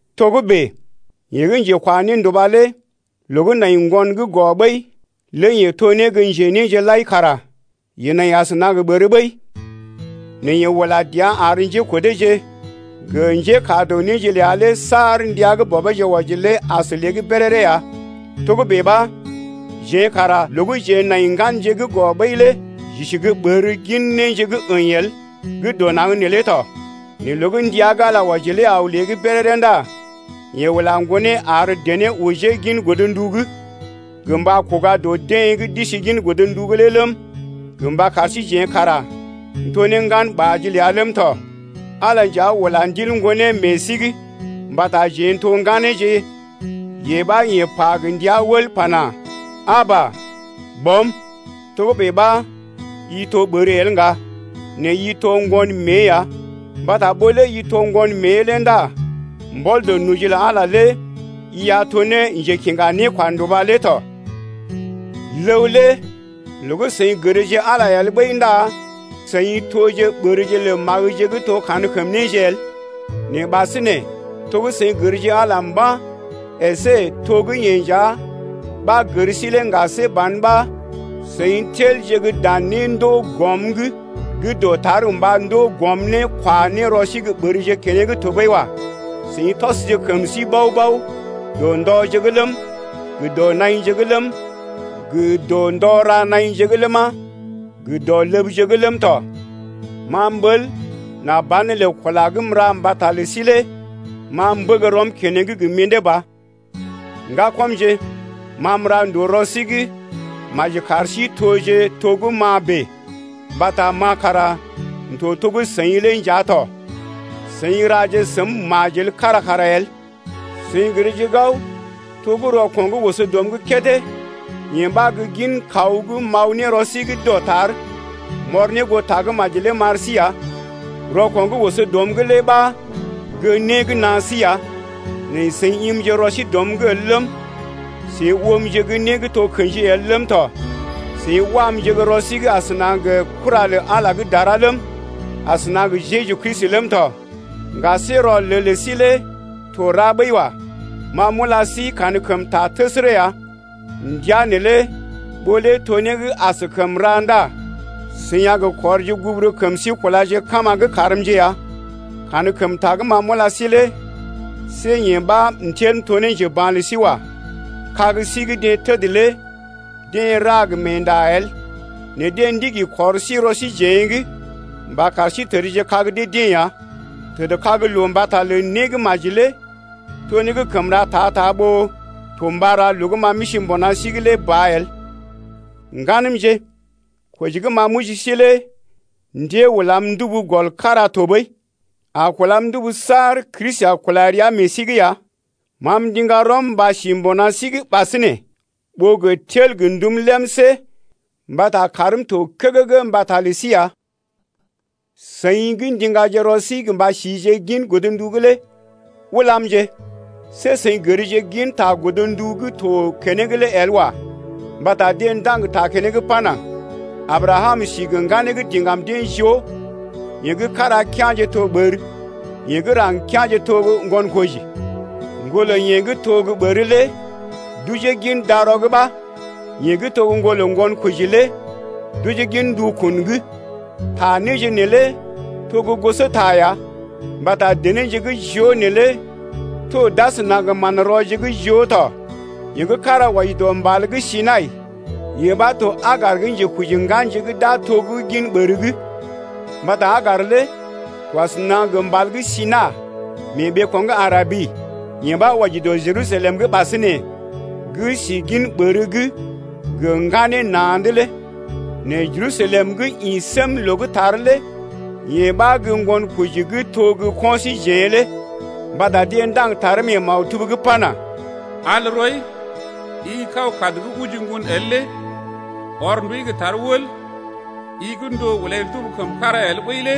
Togə́bè yeḛ gə́ njekwa nénduba lé loo gə́ nai ŋgon gə́ gɔ ɓəi, lé yeḛ to ne gə́ njenéje lai kara yeḛ nai asəna gə ɓər ɓəi. Nɛ yeḛ ula dəa ar njékodeeje gə njékaa dɔ néje ləa lé saar ndəa gə́ bɔbeeje wɔji lé as lée’g béréré ya. Togə́bè ɓa jeḛ kara loo gə́ jeḛ nai ŋganje gə́ gɔ ɓəi lé j’isi gə́ ɓərje gin néje gə́ əḭ el gə́ dɔ naŋg neelé tɔ. Nɛ loo gə́ ndəa gə́ Ala wɔji lé aw lée’g béréré ndá yeḛ ula Ŋgonee ar dené ojee gin godndu’g, gə mba kuga dɔ deḛ gə́ d’isi gin godndu’g lé ləm, gə mba kar síjeḛ kara n’to ne ŋganɓaaje ləa ləm tɔ. Ala nja ula Ndil Ŋgonee meḛ sí’g mbata jeḛ n’to ŋganeeje, yee ɓa yeḛ pa gə ndia wəl pana: Aba! Bɔm. Togə́bè ɓa i to ɓər el ŋga, nɛ i to ŋgon mée ya, mbata ɓó lé i to ŋgon mée lé ndá mbɔl dɔ noji lə Ala lé i a to ne njekiŋga nékwanduba lé tɔ. Ləw lé loo gə́ seḭ gərje Ala el ɓəi ndá seḭ toje ɓərje lə magəje gə́ to gə́ kankəm néje el. Nɛ ɓasinè to gə́ seḭ gərje Ala mba̰, əsé to gə́ yeḛ nja ɓa gər sí lé ŋga see ban ɓa seḭ telje gə́ dan néje gə́ gə mḭdé ba gə́ dɔtar mba kwaje ne rɔ sí ɓərje keneŋ tɔɓəi wa. Seḭ tɔsje kəm sí bao-bao dɔ ndɔje’g ləm, gə dɔ naḭje’g ləm, gə dɔ ndɔ ra naḭje’g ləma, gə dɔ ləbje’g ləm tɔ. Ma m’ɓəl nà banelə kula gə́ m’ra mbata lə sí lé ma m’bəg rɔm keneŋ gə mḭdé ba. Ŋgakɔmje, ma m’ra ndòo rɔ sí’g, maji kar sí toje to gə́ ma bèe mbata ma kara m’to to gə́ seḭ lé nja tɔ. Seḭ raje səm majel kára kara el. Seḭ gərje gao to gə́ rɔko̰ gə́ oso dɔm’g kédé, yee ɓa gə́ gin kaw gə́ m’aw ne rɔ sí’g dɔtar m’ɔr ne goo Tagə́maji lé m’ar sí ya. Rɔko̰ gə́ oso dɔm’g lé ɓa gə́ né gə́ naa sí ya nɛ seḭ imje rɔ sí dɔm’g el ləm, seḭ oomje gə́ né gə́ to kḛji el ləm tɔ. Seḭ wamje gə́ rɔ sí’g asəna gə kura lə Ala gə́ dara ləm, asəna gə Jeju Kristi ləm tɔ. Ŋga see rɔlel lə sí lé to ra ɓəi wa. Ma m’ula sí kankəmta təsərə ya, ndəa neelé ɓó lé to né gə́ askəm ra ndá seḭ a gə kɔrje guburu kəm sí kulaje ka̰ ma’g karmje ya. Kankəmta gə́ ma m’ula sí lé see yee ɓa m’tel m’to ne njeba̰ lə sí wa. Kag sí gə́ deḛ təd lé deḛ ra gə meenda el nɛ deḛ ndigi kɔr sí rɔ síjeḛ’g mba kar sí tədje kag dee-deḛ ya. Tədkag loo mbata lə né gə́ maji lé to né gə́ kəm ra ta-ta ɓó to mba ra loo gə́ ma m’isi mbuna sí’g lé ba el. Ŋganəmje, koji gə́ ma m’oji sí lé ndée ulam ndubu gɔl kára tɔɓəi, a kulam ndubu saar Kristi a kula rəa meḛ sí’g ya. Ma m’ndiŋga rɔm mba si mbuna sí’g ɓasinè ɓó gə tel gə ndum lemsé mbata kaarm to kəgəgə mbata lə sí ya. Seḭ gə́ ndiŋgaje rɔ sí mba sije gin godndu’g lé ulamje, see seḭ gərje ginta godndu gə́ to keneŋ lé el wa. Mbata deḛ ndaŋg ta keneŋ pana: Abrakam si gə ŋganeeje gə́ diŋgam deḛ joo, yeḛ gə́ kára kea̰je to ɓər, yeḛ gə́ raŋg kea̰je to ŋgonkoji. Ŋgolə yeḛ gə́ to gə́ ɓər lé d’ojee gin darɔ’g ɓa, yeḛ gə́ to ŋgolə ŋgonkoji lé d’ojee gin ndukun’g. Ta néje neelé to gə́ gosota ya, mbata denéje gə́ joo neelé to d’asəna gə manrɔje gə́ joo tɔ. Yeḛ gə́ kára wɔji dɔ mbal gə́ Sinai, yeḛ ɓa to Agar gə́ njekoji ŋganje gə́ d’a to gə́ gin ɓər’g lé. Mbata Agar lé to asəna gə mbal gə́ Sinai mee ɓeeko̰ gə́ Arabi, yee ɓa wɔji dɔ Jerusalem gə́ ɓasinè gə́ si gin ɓər’g gə ŋganeeje na̰’d lé. Nɛ Jerusalem gə́ ḭ sém loo gə́ tar lé yee ɓa gə́ ŋgonkoji gə́ to gə ko̰ síjeḛ lé. Mbata deḛ ndaŋg taree mee maktub’g pana: Al rɔi, i kaw kad gə́ oji ŋgon el lé! Ɔr ndui gə́ tar wəl, i gə́ ndòo ulai ndubu kəm kára el ɓəi lé!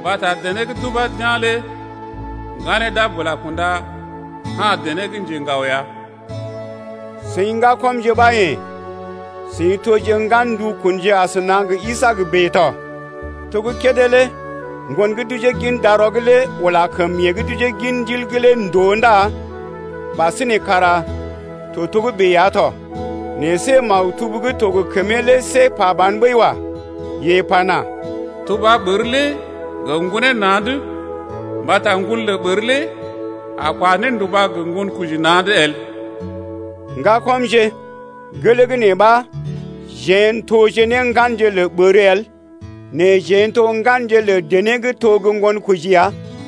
Mbata dené gə́ deḛ d’ubá d’yá̰ lé Ŋganeeje d’a bula kunda ka̰ dené gə́ njeŋgao ya. Seḭ ŋgakɔmje ɓa yḛ̀, seḭ toje ŋgan ndukunje asəna gə Isaak bèe tɔ. To gə́ kédé lé ŋgon gə́ d’ojee gin darɔ’g lé ula kəm yeḛ gə́ d’ojee gin Ndil’g lé ndòo ndá ɓasinè kara to togə́bè ya tɔ. Nɛ see maktub gə́ to gə kəmee lé see pa ban ɓəi wa. Yeḛ pana: Tuba ɓər lé gə ŋgonee na̰’d mbata ŋgon lə ɓər lé a kwa nénduba gə ŋgonkoji na̰’d el. Ŋgakɔmje, gelee gə́ nee ɓa jeḛ n’toje ne ŋganje lə ɓər el nɛ jeḛ n’to ŋganje lə dené gə́ to gə́ ŋgonkoji ya.